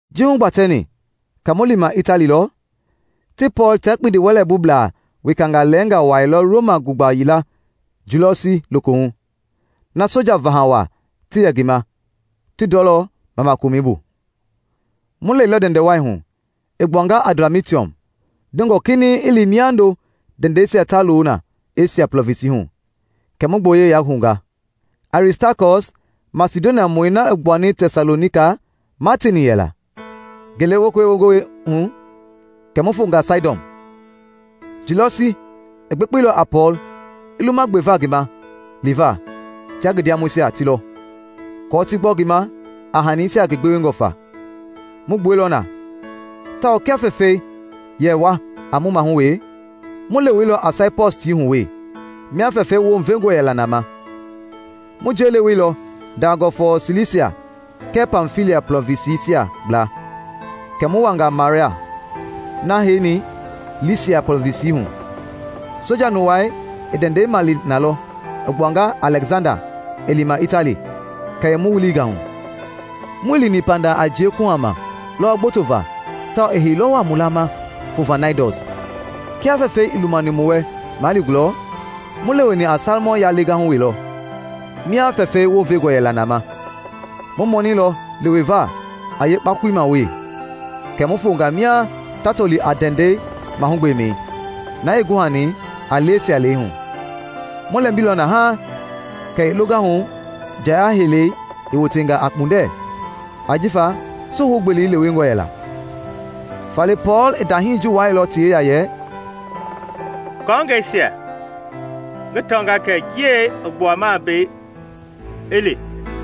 Ji hugbatɛni kɛ mu lima Itali lɔ, ti Pɔɔl tia kpindiwɛleibublaa wekangaa lɛnga wuailɔ Roma gugba yila Julɔsi lokohu, na soja vaha wa ti yɛ ngi ma ti Ndɔlɔ Mamakomɛi bu. Mu lɛilɔ ndɛndɛ wai hu i gbuanga Adramitium dongɔ kinɛiŋ i li miando ndɛndɛisia ta loo na Esia Plɔvinsi hu, kɛ mu gboyei yahounga. Aristakɔs, Masidoniamɔi na i gbuani Tɛsalonika, ma teeni yɛla. Ngele wekei wongɔi hu kɛ mu fonga Saidɔn. Julɔsi i gbekpeilɔ a Pɔɔl i luma gbeva ngi ma liva tia ngi ndiamɔisia ti lɔ, aako ti gbɔ ngi ma a hanisia ngi gbewengɔ fa. Mu gbueilɔ na, tawao kia fɛfɛi yɛ wa a mu mahu we, mu leweilɔ a Saipɔs tii hu wee mia fɛfɛi wounvengɔ yɛla na ma. Mu njei leweilɔ dangɔ fɔɔ Silisia kɛɛ Pamfilia Plɔvinsisia gbla, kɛ mu wanga Maara, na heini Laysia plɔvinsi hu. Soja nuwai i ndɛndɛi male nalɔ i gbuanga Alɛksanda i lima Itali, kɛ i mu wilinga hu. Muii lini panda a njie kuhama lɔwɔ gboto va tawao i heilɔ wa mu laama fo va Naidɔs. Kia fɛfɛi ii lumani mu wɛ maa li gulɔ, mu leweni a Salmɔn yalegahu wee lɔ mia fɛfɛi wounvengɔ yɛla na ma. Mu mɔnɛilɔ leweva a yeekakpɔi ma we, kɛ mu fonga mia ta toli a Ndɛndɛ mahugbemɛi, na ii guhani a Laysia lɛihu. Mu lɛmbilɔ na haaŋ kɛ i longahu njaya heilɛi i wotenga a kpundɛ ajifa suhou gbeli lewengɔ yɛla. Faale Pɔɔl i ndahii ji wuailɔ ti yeya yɛ, “Kɔɔngɛisia, ngi tɔnga kɛ njie i gbuama mbei i li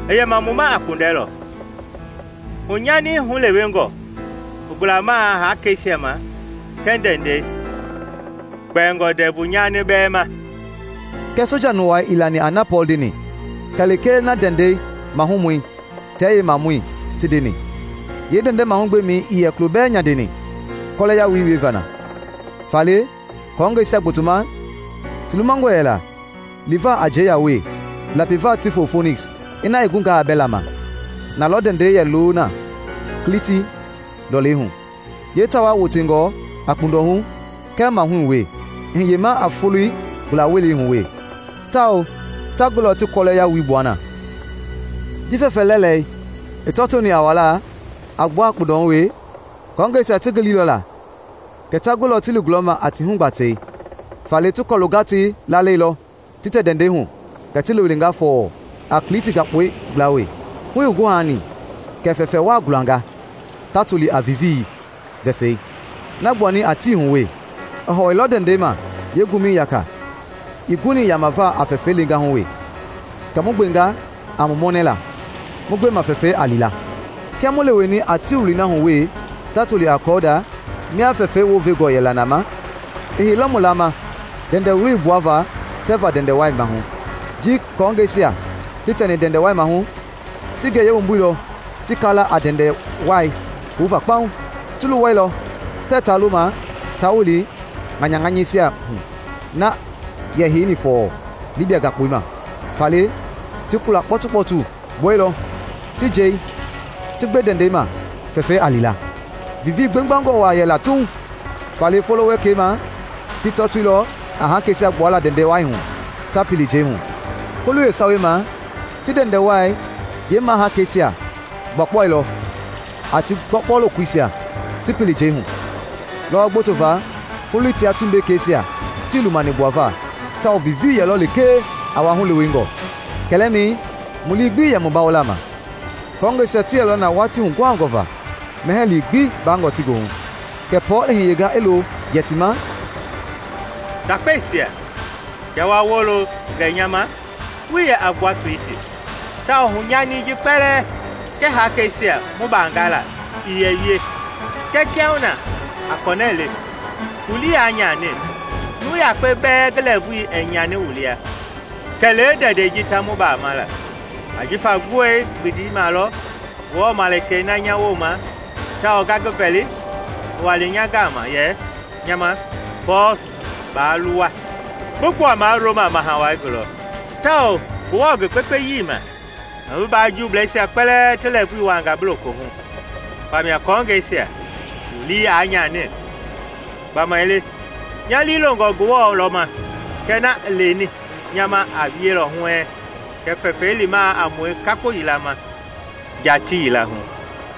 i yɛma mu ma a kpundɛ lɔ; hunyani hulewengɔ i gulamaa hakeisia ma kɛɛ ndɛndɛi, kpɛingɔ ndɛvu nyani bɛɛ ma.” Kɛɛ soja nuwai ii lani a na Pɔɔl ndeni kɛ lekee na ndɛndɛ mahumɔi tia yeemamɔi ti ndeni. Yeendɛndɛ mahugbemɛi ii yɛ kulo bɛɛ nyandeni kɔlɛ yalui wieva na; faale kɔɔngɛisia gbotoma ti lumangɔ yɛla liva a njei ya we lapiva ti fo Foniks, ina i gungaa a bɛla ma. Nalɔ ndɛndɛi yɛ loona Kliti lɔlei hu, yee tawaa wotengɔ a kpundɔhu kɛɛ mahui yaka we i hiyema a foloi gula welei hu we, tawao ta gulɔ ti kɔlɛ yalui gbua na. Ji fɛfɛ lɛlɛi i tɔtoni a wala a gbua a kpundɔhu we, kɔɔngɛisia ti gililɔ la kɛ ta gulɔ ti li gulɔma a ti hugbatɛi; faale ti kɔlu gatei laalɛilɔ ti tɛ ndɛndɛi hu kɛ ti lewenga fɔɔ a Kliti gakpɔi gbla we. Hu ii guhani kɛ fɛfɛ wa gulanga, ta toli a “Vivii” vɛfɛi na gbuani a tii hu we. I hɔwɔilɔ ndɛndɛi ma yeengumɛi yaka ii guni yamava a fɛfɛi lengahu we, kɛ mu gbenga a mu mɔnɛla mu gbema fɛfɛi a li la. Kia mu leweni a tii wuloi na hu we ta toli a Kɔuda mia fɛfɛi wounvenga yɛla na ma, i heilɔ mu laama ndɛndɛ wuloi gbuava tɛva ndɛndɛ wai maahu. Ji kɔɔngɛisia ti tɛni ndɛndɛi wai maahu, ti ngeyei wumbuilɔ ti kaala a ndɛndɛ wai houva kpauŋ. Ti luwailɔ tɛ ta loma ta wili ŋanyaŋanyɛisia hu na yɛ heini fɔɔ Libia gakpɔi ma; faale ti kula kpɔtukpɔtu gbueilɔ ti njei ti gbe ndɛndɛi ma fɛfɛi a li la. Vivii gbegbangɔ waa yɛla tuuŋ, faale folo wekei ma ti tɔtoilɔ a hakeisia gbuala ndɛndɛi wai hu ta pili njei hu; foloi yeesawei ma kɛ ti ndɛndɛwai yeemahakeisia gbuakpuailɔ a ti gbɔgbɔ lokoisia ti pili njei hu. Lɔwɔ gboto va foloi tia tumbekeisia tii lumani gbuava tawao vivii yɛlɔ lekee a wa hulewengɔ. Kɛlɛmɛi mu lii gbii yɛ mu bawola ma. Kɔɔngɛisia ti yɛlɔ na watii huguhangɔ va mɛhɛɛ lii gbi baangɔ ti goohu, kɛ Pɔɔl i hiyenga i loo yɛ ti ma, “Ndakpesia, kiaa wa wolo gɛ nya ma wuii yɛ a gbua Kliti; tawao hunyani ji kpɛlɛɛ kɛɛ hakeisia mu baangala ii yɛ wie. Kɛɛ kiahuna, a kɔnɛ le, wu lii aa nyani! Nuu yakpe bɛɛ ngi lɛɛvui ɛɛ nyani wu lia; kɛlee ndɛndɛi ji ta mu bamaala. Ajifa gbue gbindi malɔ Ngewɔ malikei na nya woma tawao nga ngi vɛli i wani nya gama yɛ nya ma, ‘Pɔɔl, baa luwa! Bi gbuamaa Roma Maha Wai gulɔ; tawao Ngewɔ, ngi gbekpeyii ma, i bi mbaa jiableisia kpɛlɛɛ ti lɛɛvui wuanga bi lokohu. Famia, kɔɔngɛisia, wu lii aa nyani! Gbamaile nya lii loongɔ Ngewɔ lɔ ma kɛ na i leni nya ma a wielɔ huɛɛŋ. Kɛɛ fɛfɛi limaa a mue kakpo yila ma nja tii yila hu.’”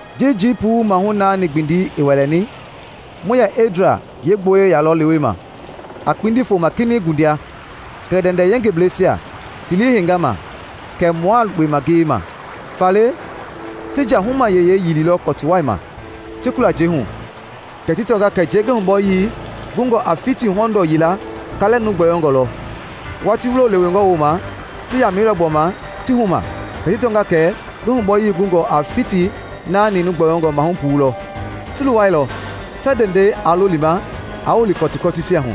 Ji jii puu mahu naani gbindi i wɛlɛni, mu yɛ Edria yeegboyei yalɔ lewema, a kpindi foma kinɛiŋ ngundia, kɛ ndɛndɛ yengebleisia ti lii heinga ma kɛ mua lukpema ngiyeima. Faale ti nja huma yeyei yililɔ kɔtuwa ma ti kula njei hu, kɛ ti tɔnga kɛ njei ngi humbɔyii gungɔ a fiti hɔndɔ yila kalɛ nuu gbɔyɔngɔ lɔ; watii wulo lewengɔ woma, ti yamailɔ gbɔma ti huma kɛ ti tɔnga kɛ ngi hunbɔyii gungɔ a fiti naani gbɔyɔngɔ mahu puu lɔ. Ti luwailɔ tɛ ndɛndɛi aa lo lima a wili kɔtukɔtuisia hu,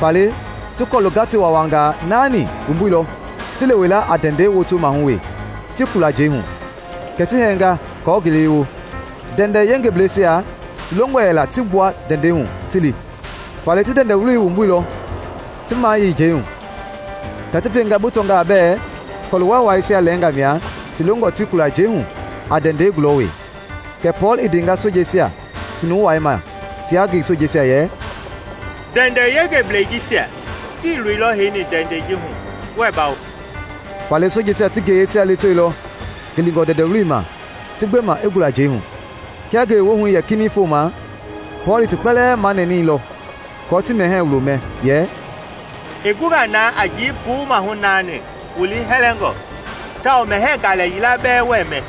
faale ti kɔlu gatewawangaa naani wumbuilɔ ti lewe la a ndɛndɛ woto maahu we ti kula njei hu. Kɛ ti hɛɛnga kɔɔ ngele i wo. Ndɛndɛ yengebleisia ti longɔ yɛla ti gbua ndɛndɛi hu ti li. Faale ti ndɛndɛi wuloi wumbuilɔ ti mayei njei hu kɛ ti pienga bi tɔngaa bɛ kɔluwaiwaisia lɛnga mia ti longɔ ti kula njei hu a ndɛndɛi gula we. Kɛ Pɔɔl i ndenga sojeisia ti nuwai ma tia ngi sojeisia yɛ, “Ndɛndɛ yengeblei jisia tii loilɔ heini ndɛndɛ ji hu, wuɛɛ bawo.” Faale sojeisia ti ngeyeisia lewetewelɔ gilingɔ ndɛndɛ wuloi ma ti gbe ma i gula njei hu. Kia ngele wohu yɛ kinɛiŋ foma, Pɔɔl i ti kpɛlɛɛ manɛni lɔ kɔɔ ti mɛhɛɛ wulo mɛ, yɛ, “I gunga na a jii puu mahu naani wu lii hɛlɛngɔ tawao mɛhɛɛ galɛ yila bɛɛ wɛɛ mɛ.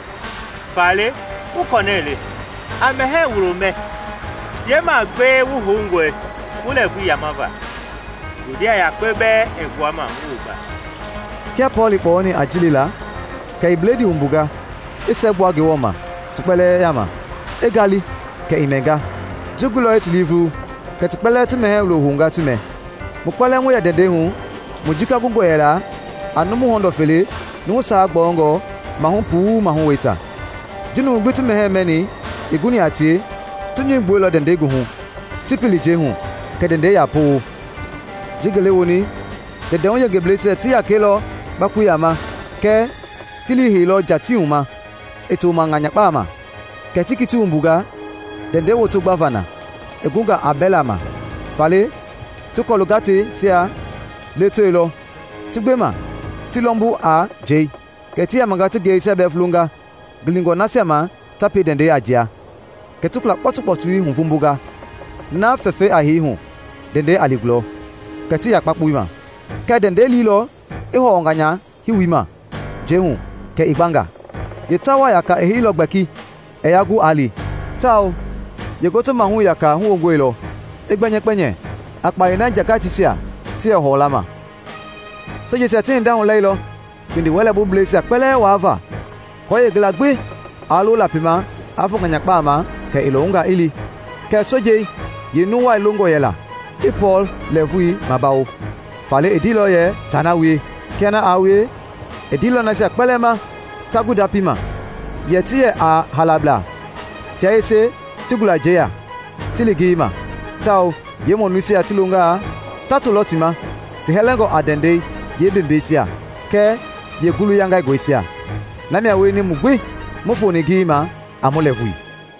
Faale, wu kɔnɛ le, a mɛhɛɛ wulo mɛ; yeemagbee wu houngɔi wu lɛɛvui yamava. Ngundia yakpe bɛɛ ɛɛ gbuama wu wumba.” Kia Pɔɔl i kpɔyɔni a ji le la, kɛ i bledii wumbunga i siɛgbua Ngewɔ ma ti kpɛlɛɛ yaama, i ngali kɛ i mɛnga. Ji guilɔ i ti lii vulu kɛ ti kpɛlɛɛ ti mɛhɛɛ wulo hounga ti mɛ. Mu kpɛlɛɛ mu yɛ ndɛndɛi hu mu jika gungɔ yɛla a numu hɔndɔ fele numu sawa gbɔyɔngɔ mahu puu mahu weita. Ji numui gbi ti mɛhɛɛ mɛni i guni a tie, ti nyɔu gbueilɔ ndɛndɛi goohu ti pili njei hu kɛ ndɛndɛi ya powo. Ji ngele woni, ndɛndɛhu yengebleisia ti yakɛilɔ kakpoiya ma, kɛɛ ti liiheilɔ nja tiihu ma i to ma ŋanyakpama, kɛ ti kiti wumbunga ndɛndɛi woto gbava na i gungaa a bɛla ma. Faale ti kɔlu gateisia lewetewelɔ ti gbe ma ti lɔmbu a njei, kɛ ti yamanga ti ngeyeisia bɛɛ vulonga gilingɔ laasia ma ta pie ndɛndɛi a njia. Kɛ ti kula kpɔtukpɔtui huvombonga na fɛfɛi a hei hu ndɛndɛi a li gulɔ, kɛ ti ya kakpoima. Kɛɛ ndɛndɛi liilɔ i hɔwɔ ŋanya hiwima njei hu kɛ i gbanga. Yeetawaa yaka i heilɔ gbɛki ɛɛ yaa gu a li, tawao yeengoto maahu yaka huwongoloilɔ i gbɛnyɛkpɛnyɛ a kpayei na njangateisia ti yɛ hɔwɔla ma. Sojeisia ti hinda hulailɔ kpindiwɛlɛbubleisia kpɛlɛɛ waa va, aako yeengila gbi aa lo lapi ma a fo ŋanyakpama kɛ i lɔwunga i li. Kɛɛ sojei yeenuwai longɔ yɛla i Pɔɔl lɛɛvui mabawo, faale i ndeilɔ yɛ taa na wie. Kia na aa wie, i ndeilɔ nasia kpɛlɛɛ ma ta gu ndapii ma yɛ ti yɛ a haalablaa tia yese ti gula njeiya ti li ngeyeima; tawao yeemɔnuisia ti longaa ta to lɔ ti ma ti hɛlɛngɔ a ndɛndɛi yeembembeesia kɛɛ yeengulu yaingaingɔisia. Namia wieni mu gbi mu foni ngeyeima a mu lɛɛvui